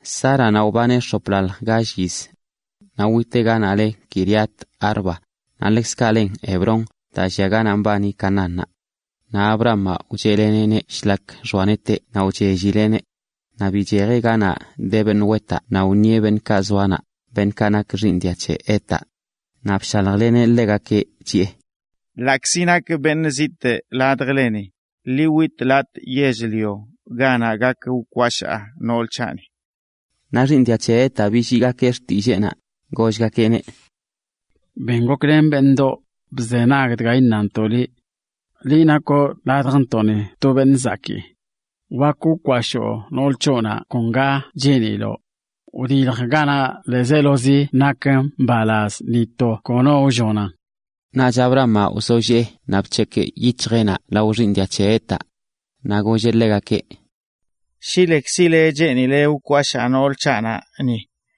Sáranaꞌ wbaneꞌ x̱oplalj gall yiz. Naꞌ witeꞌ ganaꞌ le Quiriat-arba, naꞌ ḻekzkaꞌ len Hebrón, daa llia ganaꞌ mbani Canaánnaꞌ. Naꞌ Abrahamaꞌ wcheꞌleneꞌneꞌ shlak []xoa neteꞌ naꞌ wchellileꞌneꞌ. Naꞌ bichejeꞌ ganaꞌ de beṉꞌ wetaꞌ naꞌ wṉieꞌ beṉꞌkaꞌ zoa naꞌ, beṉꞌkaꞌ nak xiiṉ dia c̱he Hetaꞌ, naꞌ bshaljleneꞌ ḻegakeꞌ, chiꞌe: ―Ḻaꞌkzi nakꞌ beṉꞌ zitꞌ ladjleni, ḻi witꞌ latꞌ yell-lio ganaꞌ gak wkwashaa nool c̱haꞌni. Naꞌ xiiṉ dia c̱he Hetaꞌ billiigakeꞌ xtilleenaꞌ, gollgakeꞌneꞌ: ―Ben goklen beṉꞌdoꞌ, bzenag dga iṉantoꞌ liꞌ. Liꞌ nakoꞌ ladjntoꞌni to beṉꞌ zakii. Wak wkwashoo nool c̱hoꞌnaꞌ kon ga cheeniloꞌ. Wdilj ganaꞌ ḻiizelozi nak mbalaz, ni to kono wllonan. Naꞌch Abrahamaꞌ wzollee naꞌ bc̱hekꞌ yic̱hjeꞌnaꞌ lao xiiṉ dia c̱he Hetaꞌ. Naꞌ golleꞌ ḻegakeꞌ: ―Shi lekzile cheenile wkwashaa nool c̱haꞌnaꞌ ni,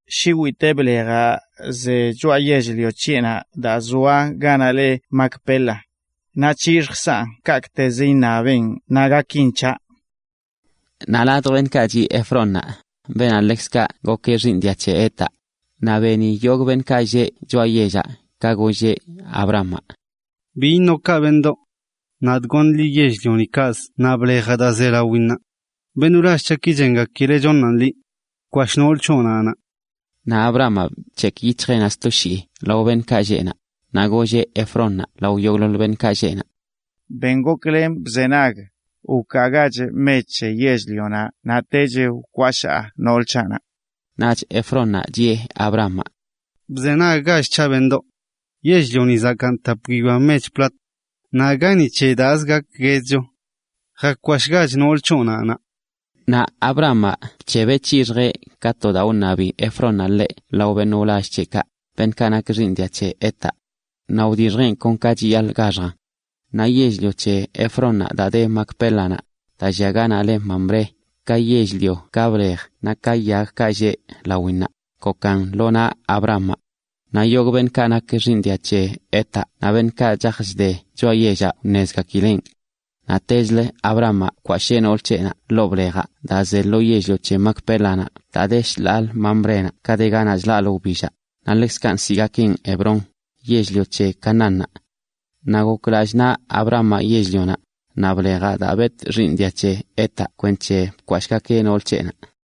shi witee blejaꞌ ze choꞌa yell-lio c̱heꞌnaꞌ daa zoa ganaꞌ le Macpela. Naꞌ c̱hixjkzaꞌn kaꞌkꞌtezə iṉabeꞌn naꞌ gakin c̱haꞌ. Naꞌ ladj beṉꞌkaꞌ chiꞌ Efrónnaꞌ, beenaꞌ ḻekzkaꞌ gokeꞌ xiiṉ dia c̱he Hetaꞌ, naꞌ beni yogꞌ beṉꞌkaꞌ lleꞌ choꞌa yellaꞌ ka golleꞌ Abrahamaꞌ: ―Bi iṉoꞌ kaꞌ, beṉꞌdoꞌ. Nadꞌ goṉꞌ liꞌ yell-lionaꞌ kaꞌzə naꞌ blejaꞌ daa ze lawinnaꞌ. Beṉꞌ wlall c̱haꞌki chengakileꞌ choṉaꞌn liꞌ. Bkwashꞌ nool c̱hoꞌnaꞌ naꞌ. Naꞌ Abrahamaꞌ bc̱hekꞌ yic̱hjeꞌnaꞌ sto shii lao beṉꞌkaꞌ lleꞌ naꞌ, naꞌ golleꞌ Efrónnaꞌ lao yogꞌḻoḻ beṉꞌkaꞌ lleꞌ naꞌ: ―Ben goklen bzenag, wkaagach mech c̱he yell-lionaꞌ naꞌ techlə wkwashaa nool c̱haꞌnaꞌ. Naꞌch Efrónnaꞌ chiꞌe Abrahamaꞌ: ―Bzenaggach c̱haꞌ, beṉꞌdoꞌ. Yell-lionaꞌ zakaan tap guiyoa mech plat. Naꞌ aga ni c̱he daazə gakguedcho. Jakwashꞌgach nool c̱hoꞌnaꞌ naꞌ. Naꞌ Abrahamaꞌ bc̱hebeꞌ c̱hixjeꞌ ka to daa wṉabi Efrónnaꞌ ḻeꞌ lao beṉꞌ wlall c̱heꞌkaꞌ, beṉꞌkaꞌ nak xiiṉ dia c̱he Hetaꞌ. Naꞌ wdixjeꞌn kon ka chiyaḻꞌ gaxjan. Naꞌ yell-lio c̱he Efrónnaꞌ daa de Macpélanaꞌ, daa llia ganaꞌ le Mamré, ka yell-lio, ka blej naꞌ ka yagkaꞌ lleꞌ lawinnaꞌ, gokan ḻoo naꞌ Abrahamaꞌ. Naꞌ yogꞌ beṉꞌkaꞌ nak xiiṉ dia c̱he Hetaꞌ naꞌ beṉꞌkaꞌ chaj chde choꞌa yellaꞌ wṉezgakileꞌn. Naꞌtechlə, Abrahamaꞌ bkwashee nool c̱heꞌnaꞌ ḻoo blejaꞌ daa ze lo yell-lio c̱he Macpélanaꞌ daa de shḻaalə Mamrénaꞌ ka de ganaꞌ chlaꞌlə wbillaꞌ, naꞌ ḻekzkaꞌ nsiꞌgakeꞌn Hebrón, yell-lio c̱he Canaánnaꞌ. Naꞌ gok lallꞌ naꞌ Abrahamaꞌ yell-lionaꞌ, naꞌ blejaꞌ, daa betꞌ xiiṉ dia c̱he Hetaꞌ kwenc̱he bkwashee nool c̱heꞌnaꞌ.